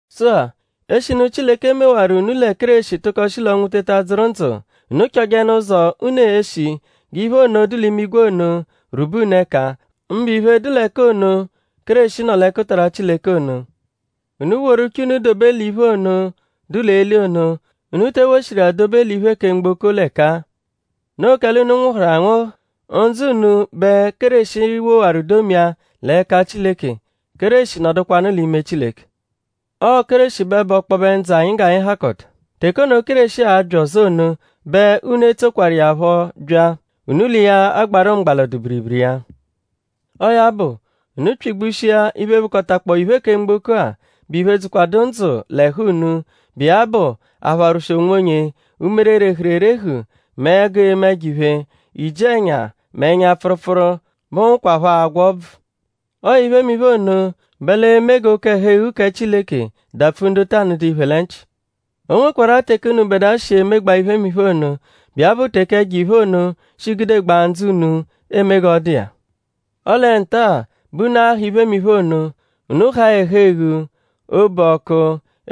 Sụ-a; eshinu Chileke mewaru unu lẹ Kéreshi tụko shi l'ọnwu teta dzụru ndzụ; unu chọjenu ụzo, unu e-shi g'iphe ono, dụ l'imigwe ono rwube unu ẹka; mbụ iphe, dụ l'ẹka ono, Kéreshi nọ l'ẹkutara Chileke ono. Unu woru uche unu dobe l'iphe ono, dụ l'eli ono; unu te ewoshiru iya dobe l'iphe kẹ mgboko l'ẹka-a. Noo kẹle unu nwụhuru anwụhu. Ndzụ unu bẹ Kéreshi wowaru domia l'ẹka Chileke. Kéreshi nọdukwanu l'ime Chileke. Ọo Kéreshi bẹ bụ ọkpobe ndzụ anyi g'anyi hakọta. Teke ono, Kéreshi a-bya ọzo ono bẹ unu e-tsokwaru iya phọ bya. Unu l'iya agbarụ mgba l'ọdu-biribiri iya. Ọo ya bụ; unu pyị-gbushia iphe, bụkotakpoo iphe kẹ mgboko-a, bụ iphe, dzụkwadu ndzụ l'ẹhu unu, bụ iya bụ; apharwụshi onwonye; umere, rehuru erehu mẹ ẹgu eme ẹjo-iphe; iji-ẹnya mẹ ẹnya-pfụrupfuru, bụhukwapho agwa ọbvu. Ọo iphemiphe ono bẹ l'e-me g'oke-ẹhu-eghu kẹ Chileke dapfu ndu ta nụdu iphe lẹ nchị. O nwekwarụ-a teke unubẹdua shi emegbaa iphemiphe ono, bụ iya bụ teke ẹjo-iphe ono shi gudegbaa ndzụ unu eme g'ọ dụ iya. Ọle nta-a bẹ unu a-ha iphemiphe ono. Unu haa ẹhu-eghu; obu ọku;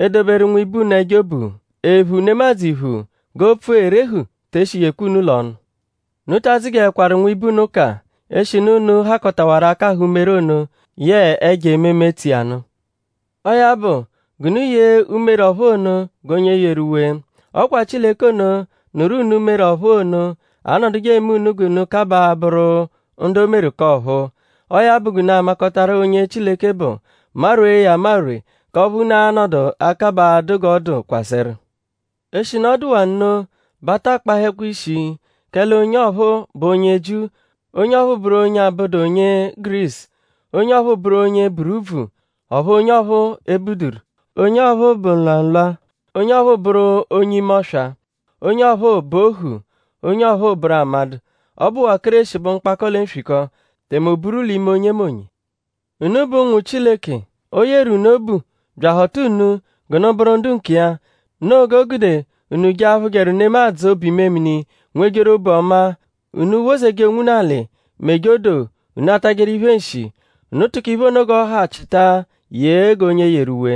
edoberu nwibe unu ẹjo obu; ephu nemadzụ iphu. G'opfu erehu te eshijekwa unu l'ọnu. Unu ta adzụjekwaru nwibe unu ụka; eshinu unu hakọtawaru akahụ umere ono yẹe ẹjo ememe, tso iya nụ. Ọo ya bụ g'unu yee umere ọ̀phúú ono g'onye yeru uwe. Ọ kwa Chileke ono, nụru unu umere ọ̀phúú ono anọduje eme unu g'unu kabaa abụru ndu o meru k'ọ̀phúú. Ọo ya bụ g'unu amakọtaru onye Chileke bụ; marwee ya amarwe k'ọphu unu a-nọdu akabaa adụ g'ọ dụ kwasẹru. Eshinu ọ dụwaa nno bẹ a ta akpahẹkwa ishi kẹ l'onye ọphuu bụ onye Jiu; onye ọphuu bụru onye abụdu onye Gurisu; onye ọphuu bụru onye buru úbvù; ọphu onye ọphuu ebuduru. Onye ọphuu bụ nlwamụlwa; onye ọphuu bụru onye ime-ọswa. Onye ọphuu bụ ohu; onye ọphuu bụru amadụ. Ọ bụwaa Kéreshi bụ mkpakọ lẹ nswikọ; tẹme o buru l'ime onyemonye. Unu bụ ụnwu Chileke. O yeru unu obu bya ahọta unu g'unu bụru ndu nkiya. Noo g'o gude unu je aphụjeru nemadzụ obu-imemini; nwejeru obu ọmaa; unu wozeje onwunu alị; meje odoo; unu atajẹru iphe nshi. Unu tụko iphe ono g'ọ hakọta chịta yee g'onye yeru uwe.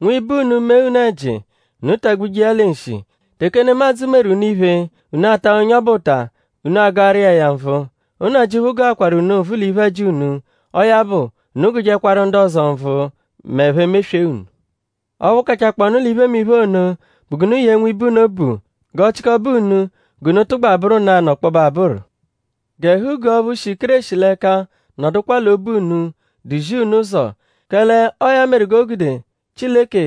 Nwibe unu -mee unu ẹji; unu tagbuje iya lẹ nshi. Teke nemadzụ meru unu iphe, unu a-ta onye ọbu ụta; unu agụaru iya ya nvụ. Nnajịuphu gụakwaru unu nvụ l'iphe-ẹji unu. Ọo ya bụ; unu gụjekwaru ndu ọzo nvụ m'ẹphe meswee unu. Ọphu kachakpọonu l'iphemiphe ono bụ g'unu yee nwibe unu obu. G'ọ chịkobe unu g'unu tụgba bụru nanụ ọkpobe abụru. G'ẹhu-guu ọphu shi Kéreshi l'ẹka nọdukwa l'obu unu; duzi unu ụzo; kẹle ọo ya meru g'o gude Chileke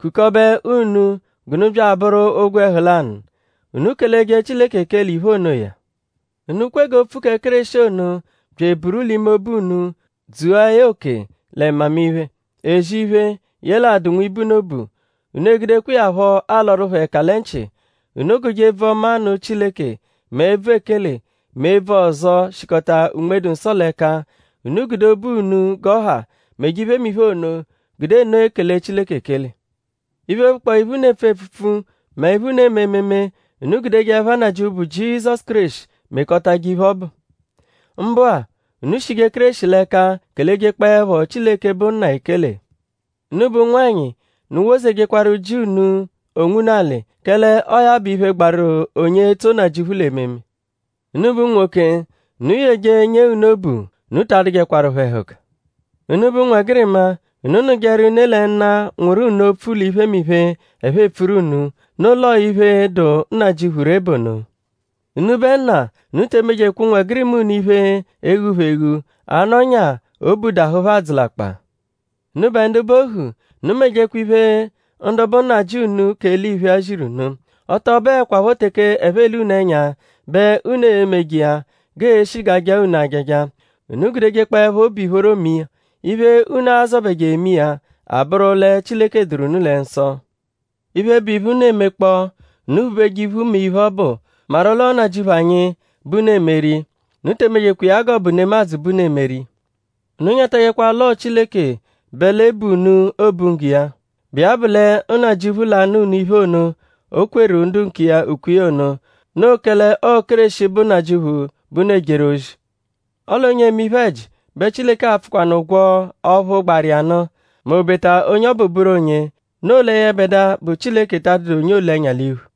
kukọbe unu g'unu bya abụru ogwẹhu lanụ. Unu keleje Chileke ekele iphe onoya. Unu kwe g'opfu kẹ Kéreshi ono bya eburu l'ime obu unu dzua ya oke lẹ mmamiphe; ezi iphe; yẹle adụ nwibe unu obu. Unu egudekwa iya phọ alọru phẹ ẹka lẹ nchị. Unu gụje ebvu-ọma nụ Chileke; mẹ ebvu ekele; mẹ ebvu ọzo, shikọta Unme-dụ-Nsọ l'ẹka. Unu gude obu unu g'ọ ha meje iphemiphe ono; gude nno ekele Chileke ekele. Iphe, bụkpoo iphe, unu epfu epfupfu mẹ iphe, unu eme ememe; unu gudeje ẹpha Nnajịuphu, bụ Jizọsu Kéreshi mekọtaje iphe ọbu. Mbụ-a; unu shije Kéreshi l'ẹka kelejekpọepho Chileke, bụ Nna ekele. Unubẹ ụnwanyi; unu wozejekwaru ji unu onwunu alị; kẹle ọo ya bụ iphe, gbaru onye etso Nnajịuphu l'ememe. Unubẹ unwoke; unu yeje nyee unu obu. Unu ta adụjekwaru phẹ ẹhuka. Unubẹ ụnwegirima; unu nụjeru ne lẹ nna, nwụru unu opfu l'iphemiphe, ẹphe epfuru unu. Noo l'ọo iphe, dụ Nnajịuphu ree bụ ono. Unubẹ nna; unu te emejekwa ụnwegirima unu iphe, e-ghu phẹ eghu; anọnya obu dahụ phẹ adzụlakpa. Unubẹ ndu bụ ohu; unu mejekwa iphe, ndu bụ nnajị unu k'eliphe-a ziru unu. Ọ tọ bụekwapho teke ẹphe ele unu ẹnya bẹ unu e-meje iya g'ee-shi g'aa-jaa unu ajaja. Unu gudejekpọepho obu ìphóró me iya. Iphe, unu azọbeje eme iya abụru lẹ Chileke dụru unu lẹ nsọ. Iphe, bụ iphe, unu emekpọo; unu phubeje iphu me iphe ọbu maru l'ọo Nnajịuphu anyi bẹ unu emeru iya. Unu te emejekwa iya g'ọ bụ nemadzụ bẹ unu emeru iya. Unu nyatajẹkwa l'ọo Chileke bẹ l'e-bu unu obunggo iya, bụ iya bụ lẹ Nnajịuphu l'a-nụ unu iphe ono, o kwetarụ ndu nkiya ukwe iya ono. Noo kẹle ọo Kéreshi bụ Nnajịuphu, bẹ unu ejeru ozi. Ọle onye eme iphe-ẹji bẹ Chileke a-pfụkwanu ụgwo ọphu gbaru iya nụ; m'obeta onye ọbu bụru onye. Noo lẹ yẹbedua, bụ Chileke ta adụdu onye oole ẹnya l'iphu.